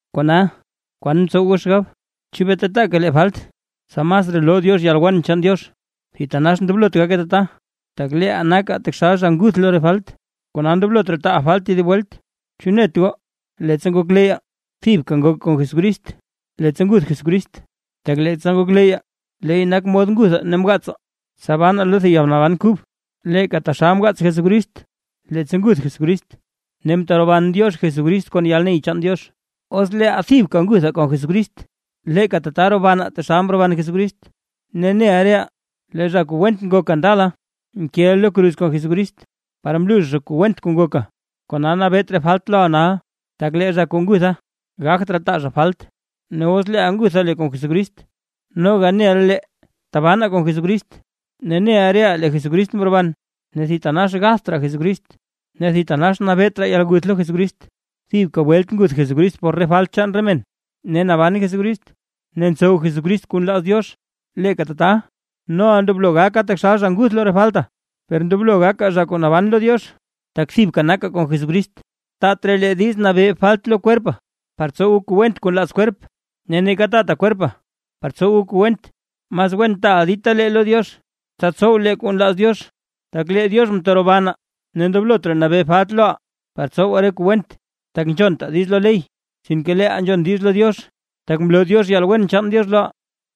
Kona, ¿kwan ntsow goo xgab? ¿Chu bee tataaka lee falt, tsa masraa loo Diox yalwen chaan Diox? ¡Thitanax ndoblot gake tata! Tak leeʼaa nakaa taxal zha kuu nguth lo re falt; kona ndoblot raa taaʼaa falt tedib welt. ¿Chu net goo, leettsa ngokleyyaa, thibka ngokaa kon Jesucrist leettsa nguth Jesucrist? Tak leettsa ngokleyyaa, leey nak mod nguthaa ne mgaatsaa, tsa banaa lo thib yalnaban kub; leeka taxal mgaats Jesucrist leettsa nguth Jesucrist ne mteroban Diox Jesucrist kon yalney chaan Diox. Os leeʼaa thibka nguthaa kon Jesucrist, leeka tata robanaa taxal mroban Jesucrist. Ne neʼa reʼaa lee zha went kuu ngokaa ndala, mkeʼa lo kruz kon Jesucrist, par mluux zha kuu went kuu ngokaa, kona nabeet raa falt loʼaa nal. Tak lee zha kuu ngutha gagt raa taa zha falt. Ne os leeʼaa ngutha lee kon Jesucrist, noga neʼa lee tabanaa kon Jesucrist, ne neʼa reʼaa lee Jesucrist mroban, ne thitanax gatht raa Jesucrist; ne thitanax nabeet raa yalguth lo Jesucrist. Thibka welt nguth Jesucrist por re falt chaan re men, ne naban Jesucrist ne ntsow Jesucrist kuu nlaaz Diox. Leeka tata noʼaa ndoblo gakaa taxal zha nguth lo re faltaa, per ndoblo gakaa zha kuu naban lo Diox, tak thibka nakaa kon Jesucrist. Taat raa lee diiz nabee falt lo kwerpaa, par tsowaa kuu went kuu nlaaz kwerp. Ne neeka taataa kwerpaa par tsowaa kuu went. Mas wen taaʼaa ditalee lo Diox, tsa tsow lee kuu nlaaz Diox, tak lee Diox mterobanaa. Ne ndoblot raa nabee falt loʼaa par tsowaa re kuu went, tak nzhontaa diiz lo ley sinke leeʼaa nzhon diiz lo Diox, tak mloo Diox yalwen chaan Diox loʼaa.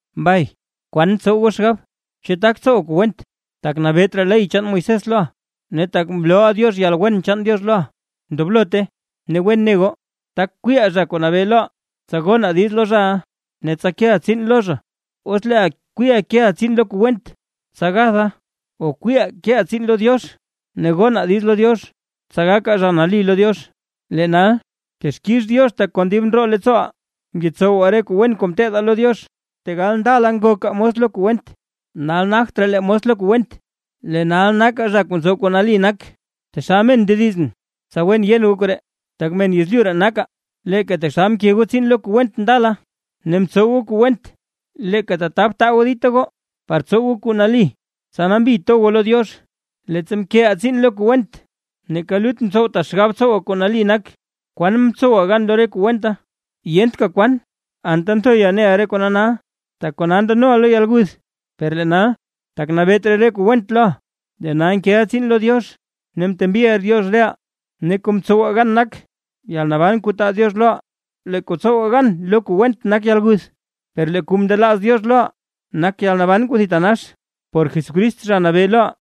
Mbay, ¿kwan ntsow goo xgab? ¿Chu tak tsowaa kuu went, tak nabeet raa ley chaan Moisés loʼaa, ne tak mloo Diox yalwen chaan Diox loʼaa? ¡Ndoblote! Ne wen ne goo, tak kwiiʼaa zha kuu nabee loʼaa, tsa gonaa diiz lo zhaʼa, ne tsa keʼaa tsiin lo zha. Os leeʼaa kwiiʼaa keʼaa tsiin lo kuu went tsa gathaa, o kwiiʼaa keʼaa tsiin lo Diox ne gonaa diiz lo Diox, tsa gakaa zha nali lo Diox. Lee nal texkix Diox tak kon dib ndroo leettsooʼaa ngetsowaa re kuu wen kuu mteedaa lo Diox, tegal ndala ngokaa mos lo kuu went. Nal nagt raa lee mos lo kuu went. Lee nal nakaa zha kuu ntsow kuu nali nak. Taxal men ndedizʼn, tsa wen yen goo koree, tak men yezlyu ree nakaa. Leeka taxal mke goo tsiin lo kuu went ndala ne mtsow goo kuu went, leeka tata btaa goo dita goo par tsow goo kuu nali, tsa nambi to goo lo Diox. Leettsa mkeʼaa tsiin lo kuu went, neeka lut mtsowtaa xgab tsowaa kuu nali nak. Per, ¿kwan mtsowaa gan lo re kuu wenta? ¡Yentka kwan! Anta nthoyaa neʼaa re kona nal. Tak kona ndanoʼaa lo yalguth. Per lee nal, tak nabeet raa re kuu went loʼaa; lee nal nkeʼaa tsiin lo Diox, ne mtembiʼaa Diox reʼaa ne kuu mtsowaa gan nak yalnaban kuu taa Diox loʼaa. Lee kuu tsowaa gan lo kuu went nak yalguth, per lee kuu mndelaaz Diox loʼaa nak yalnaban kuu thitanax, por Jesucrist Zha Nabee loʼaa.